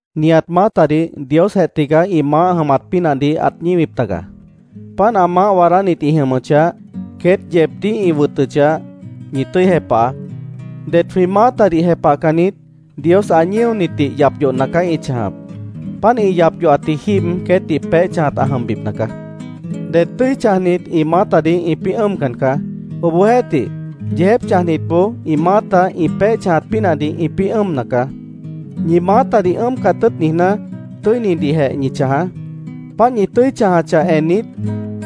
Nihat maátadih Diosjeh tigaá ĩ maáh jʉmat pínahdih ãt ñíwip taga. Páant ã maáh waadánit ĩ jʉmʉchah, queét yeebdíh ĩ wʉtʉchah, ñi tʉ́i jepahaá. Det jwĩ maátadih jepahcannit, Dios ã ñíonitdih yap yohna caá ĩ chãjap. Páant ĩ yap yohatji jíib queétdih peéh chãjat ã jʉmbipna caá. Det tʉ́i chãjnit ĩ maátadih ĩpĩ́ ʉ́ʉmcan caá. Obohjeéhtih, yeejép chãjnitboó ĩ maáta ĩ peéh chãjat pínahdih ĩpĩ́ ʉ́ʉmna caá. Ñi maátadih ʉ́ʉmcat tʉ́ʉt niijná, tʉ́inidihjeh ñi chãjaá. Páant ñi tʉ́i chãjachah ennit,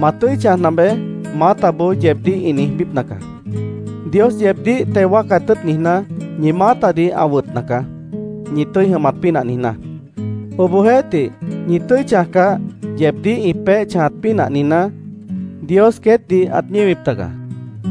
“Ma tʉ́i chãjna beé”, maátaboó yeebdíh ĩ niijbípna caá. Dios yeebdíh teo wáacat tʉ́ʉt niijná, ñi maátadih ã wʉtna caá, ñi tʉ́i jʉmat pínah niijná. Obohjeéhtih, ñi tʉ́i chãjcah, yeebdíh ĩ peéh chãjat pínah niijná, Dios queétdih ãt ñíwip taga.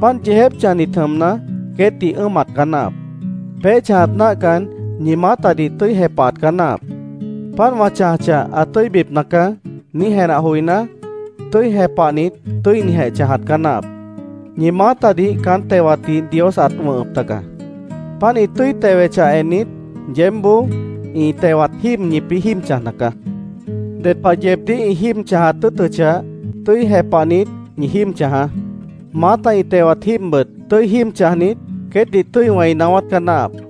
Páant yeejép chãjnit jʉmna, queétdih ʉ́ʉmat caá náahap. Peéh chãjat náahcan, ñi maátadih tʉ́i jepahat caá náahap. “Páant wã chãjachah, ã tʉ́ibipna caá”, niíj jenah joiná, tʉ́i jepahnit, tʉ́inijeh chãjat caá náahap. Ñi maátadih caán tewatdih Dios ãt wʉ̃hʉp taga. Páant ĩ tʉ́i tewechah ennit, yeébboó ĩ tewat jíib ñipĩ́ jíib chãjna caá. Ded pah yeebdíh ĩ jíib chãjat tʉ́ʉtʉchah, tʉ́i jepahnit, ñi jíib chãjaá. Maáta ĩ tewat jíibbʉt, tʉ́i jíib chãjnit, queétdih tʉ́i wẽi naáwát caá náahap.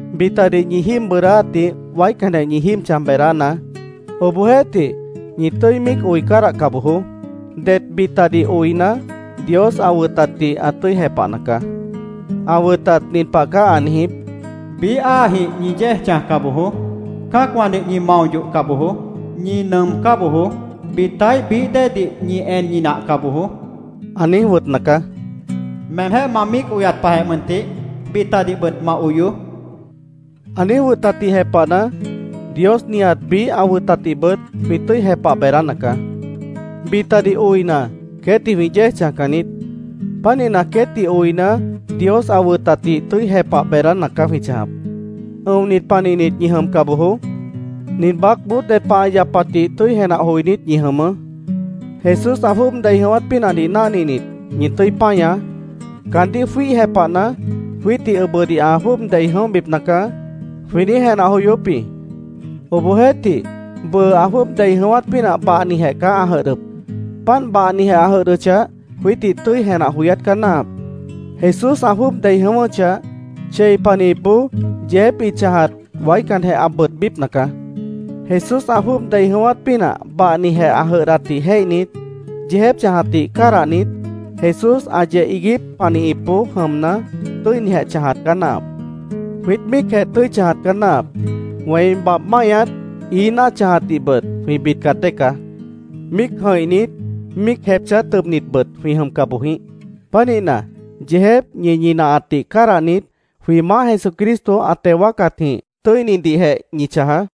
Bitadih ñi jíib bʉʉdáátdih waícanjeh ñi jíib chãj beedánaá. Obohjeéhtih, ñi tʉ́i míic oi cádahca bojoó. Det bitadih oina, Dios ã wʉtatdih ã tʉ́i jepahna caá. Ã wʉtat nin pah caá ã niijíp: “Biíh áajĩh ñi yéej chãjca bojoó. Cã́acwãdih ñi mao yohca bojoó. Ñi nʉʉmcá bojoó. Bitaíh bií déedih ñi en ñinahca bojoó”, ã niíj wʉtna caá. “Meemjéh ma míic oyat pahjeh mʉntih, bitadihbʉt ma oyoó”, ã niíj wʉtatdih jepahna, Dios nihat biíh ã wʉtatdihbʉt jwĩ tʉ́i jepah beedána caá. Bitadih oina, queétdih jwĩ yéej chãjcan niít. Pánihna, queétdih oina, Dios ã wʉtatdih tʉ́i jepah beedána caá jwĩ chãjap. Ʉ̃onit panihnit ñi jʉmca bojoó. Nin baácboó ded pah ã yapatdih tʉ́i jenah joinít ñi jʉmʉʉ́. Jesús ã jwʉ́ʉb dei jʉ̃ʉ́wát pínahdih náhninit, ñi tʉ́i páñaá. Caandíh jwíih jepahna, “Jwiítdih ʉbʉdih ã jwʉ́ʉb dei jʉ̃óhbipna caá”, jwĩ niíj jenah joyóp jĩ. Obohjeéhtih, bʉʉ ã jwʉ́ʉb dei jʉ̃ʉ́wát pínah bahnijeh caá ã jʉdhdʉp. Páant bahnijeh ã jʉdhdʉchah, jwiítdih tʉ́i jenah joyát caá náahap. Jesús ã jwʉ́ʉb dei jʉ̃ʉ́wʉ́chah, chei panihipboó yeejép ĩ chãjat waícanjeh ã bʉʉdbípna caá. Jesús ã jwʉ́ʉb dei jʉ̃ʉ́wát pínah bahnijeh ã jʉdhdatdih jéihnit, yeejép chãjatdih cádahnit, Jesús ã yeh iiguíp panihipboó jʉmna, tʉ́inijeh chãjat caá náahap. Jwiít míicjeh tʉ́i chãjat caá náahap. Wẽi babh máihñat, ií náah chãjatdihbʉt jwĩ bidcat dée caá. Míic jʉ̃ihnit, míic jepchá tʉbnitbʉt jwĩ jʉmca boj jĩíh. Pánihna, yeejép ñi ñinahatdih cádahnit, jwĩ Maáh Jesucristo ã teo wáacatjĩh tʉ́inidihjeh ñi chãjaá.